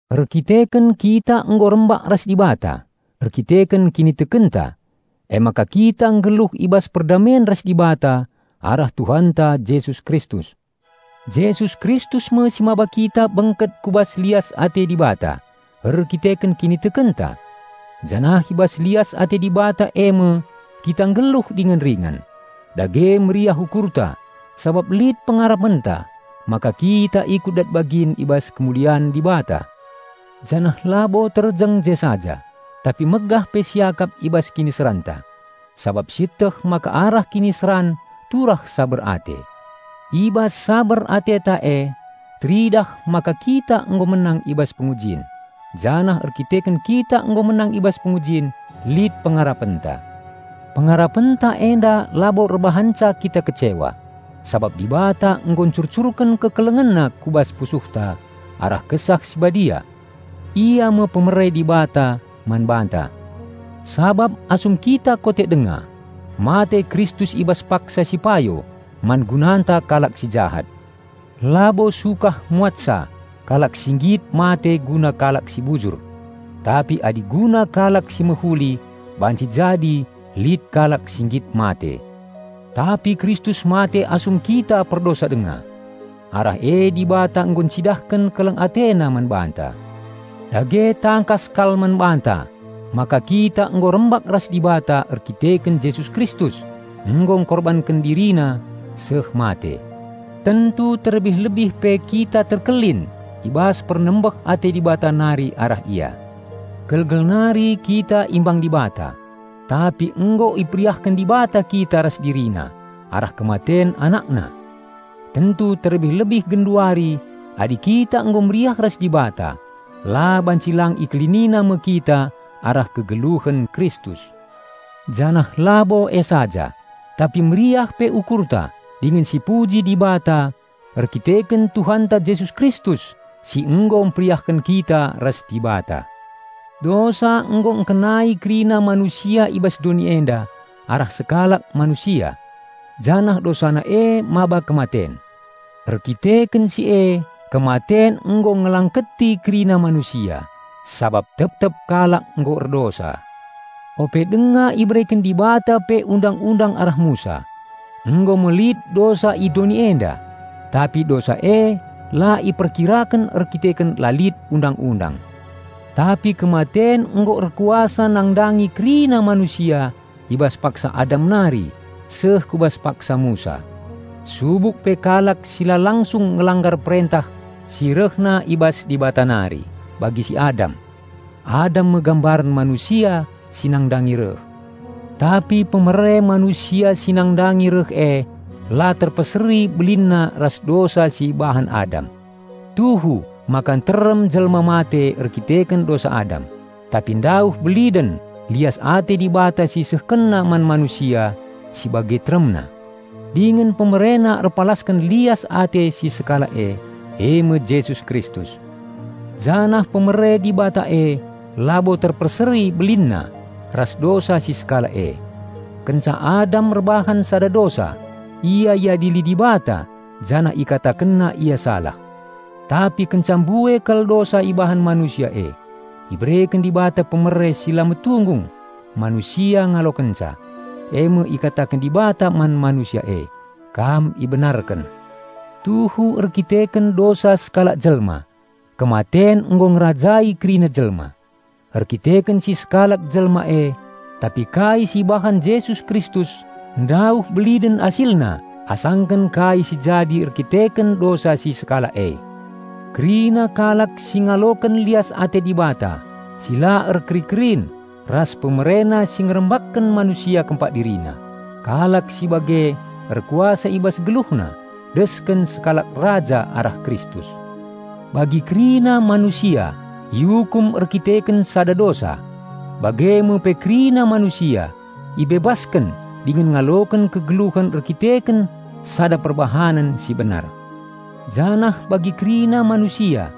Erdandanken kita nggo rembak ras Dibata erkiteken kinitekenta, emaka kita nggeluh i bas perdamen ras Dibata arah Tuhanta Jesus Kristus. Jesus Kristus me si maba kita bengket ku bas lias ate Dibata erdandanken kinitekenta. Janah i bas lias ate Dibata eme kita nggeluh dingen ringan. Dage meriah ukurta sabap lit pengarapenta maka kita ikut dat bagin i bas kemulian Dibata. Janah labo terjeng je saja, tapi megah pe siakap i bas kiniseranta, sabap sieteh maka arah kiniseran turah saber ate. I bas saber ateta e teridah maka kita nggo menang i bas pengujin, janah erkiteken kita nggo menang i bas pengujin, lit pengarapenta. Pengarapenta enda labo erbahanca kita kecewa, sabap Dibata nggo ncurcurken KekelengenNa ku bas pusuhta arah Kesah Si Badia. Ia me pemere Dibata man banta. Sabap asum kita kote denga, mate Kristus i bas paksa si payo, man gunanta kalak si jahat. Labo sukah muatsa kalak si nggit mate guna kalak si bujur. Tapi adi guna kalak si mehuli banci jadi lit kalak si nggit mate. Tapi Kristus mate asum kita perdosa denga! Arah e Dibata nggo encidahken keleng AteNa man banta. Dage tangkas kal man banta maka kita nggo rembak ras Dibata erkiteken Jesus Kristus nggo engkorbanken DiriNa seh mate; tentu terlebih-lebih pe kita terkelin i bas pernembeh ate Dibata nari arah Ia. Gelgel nari kita imbang Dibata, tapi nggo iperiahken Dibata kita ras DiriNa arah kematen AnakNa. Tentu terlebih-lebih genduari adi kita nggo meriah ras Dibata la banci lang IkeliniNa me kita arah kegeluhen Kristus. Janah labo e saja, tapi meriah pe ukurta dingen sipuji Dibata erdandanken Tuhanta Jesus Kristus si nggo mperiahken kita ras Dibata. Dosa nggo ngkenai kerina manusia i bas doni enda arah sekalak manusia, janah dosana e maba kematen. Erkiteken si e kematen nggo ngelangketi kerina manusia, sabap tep-tep kalak nggo erdosa. Ope denga ibereken Dibata pe Undang-undang arah Musa, nggo me lit dosa i doni enda, tapi dosa e la iperkiraken erkiteken la lit undang-undang. Tapi kematen nggo erkuasa nandangi kerina manusia i bas paksa Adam nari seh ku bas paksa Musa, subuk pe kalak si la langsung ngelanggar perentah si rehna i bas Dibata nari bagi si Adam. Adam me gambaren Manusia si nandangi reh. Tapi pemere Manusia si nandangi reh e la terpeseri belinna ras dosa si ibahan Adam. Tuhu maka nterem jelma mate erdandanken dosa Adam, tapi ndauh beliden lias ate Dibata si IsehkenNa man manusia si bage teremna, dingen PemereNa erpalasken lias ate si Sekalak e, eme Jesus Kristus. Janah pemere Dibata e labo terpeseri belinna ras dosa si sekalak e. Kenca Adam erbahan sada dosa, ia iadili Dibata janah IkatakenNa ia salah. Tapi kenca mbue kal dosa ibahan manusia e, ibereken Dibata pemere si la metunggung manusia ngalokenca, eme ikataken Dibata man manusia e, "Kam ibenarken." Tuhu erdandanken dosa sekalak jelma, kematen nggo ngerajai kerina jelma, erkiteken si sekalak jelma e. Tapi kai si ibahan Jesus Kristus ndauh beliden asilna asangken kai si jadi erdandanken dosa si sekalak e! Kerina kalak si ngaloken lias ate Dibata si la erkeri-kerin ras PemereNa si ngerambakken manusia kempak DiriNa, kalak si bage erkuasa i bas geluhna desken sekalak raja arah Kristus. Bagi kerina manusia iukum erdandanken sada dosa, bage me pe kerina manusia ibebasken dingen ngaloken kegeluhen erdandanken sada perbahanen si benar. Janah bagi kerina manusia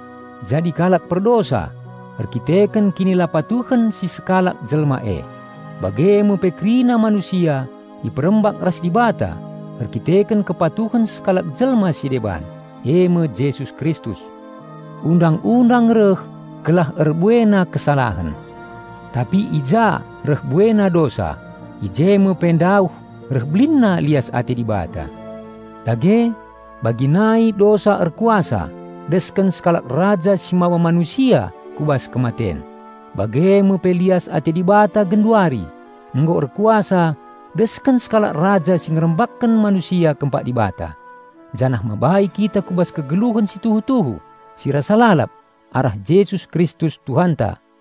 jadi kalak perdosa erdandanken kinilapatuhen si sekalak jelma e, bage me pe kerina manusia iperembak ras Dibata erdandanken kepatuhen sekalak jelma si deban, eme Jesus Kristus. Undang-undang reh gelah erbuena kesalahen; tapi i ja reh buena dosa, i je me pe ndauh reh belinna lias ate Dibata. Dage, bagi nai dosa erkuasa desken sekalak raja si maba manusia ku bas kematen, bage me pe lias ate Dibata genduari nggo erkuasa desken sekalak raja si ngerambakken manusia kempak Dibata, janah mabai kita ku bas kegeluhen si tuhu-tuhu si rasa lalap arah Jesus Kristus Tuhanta.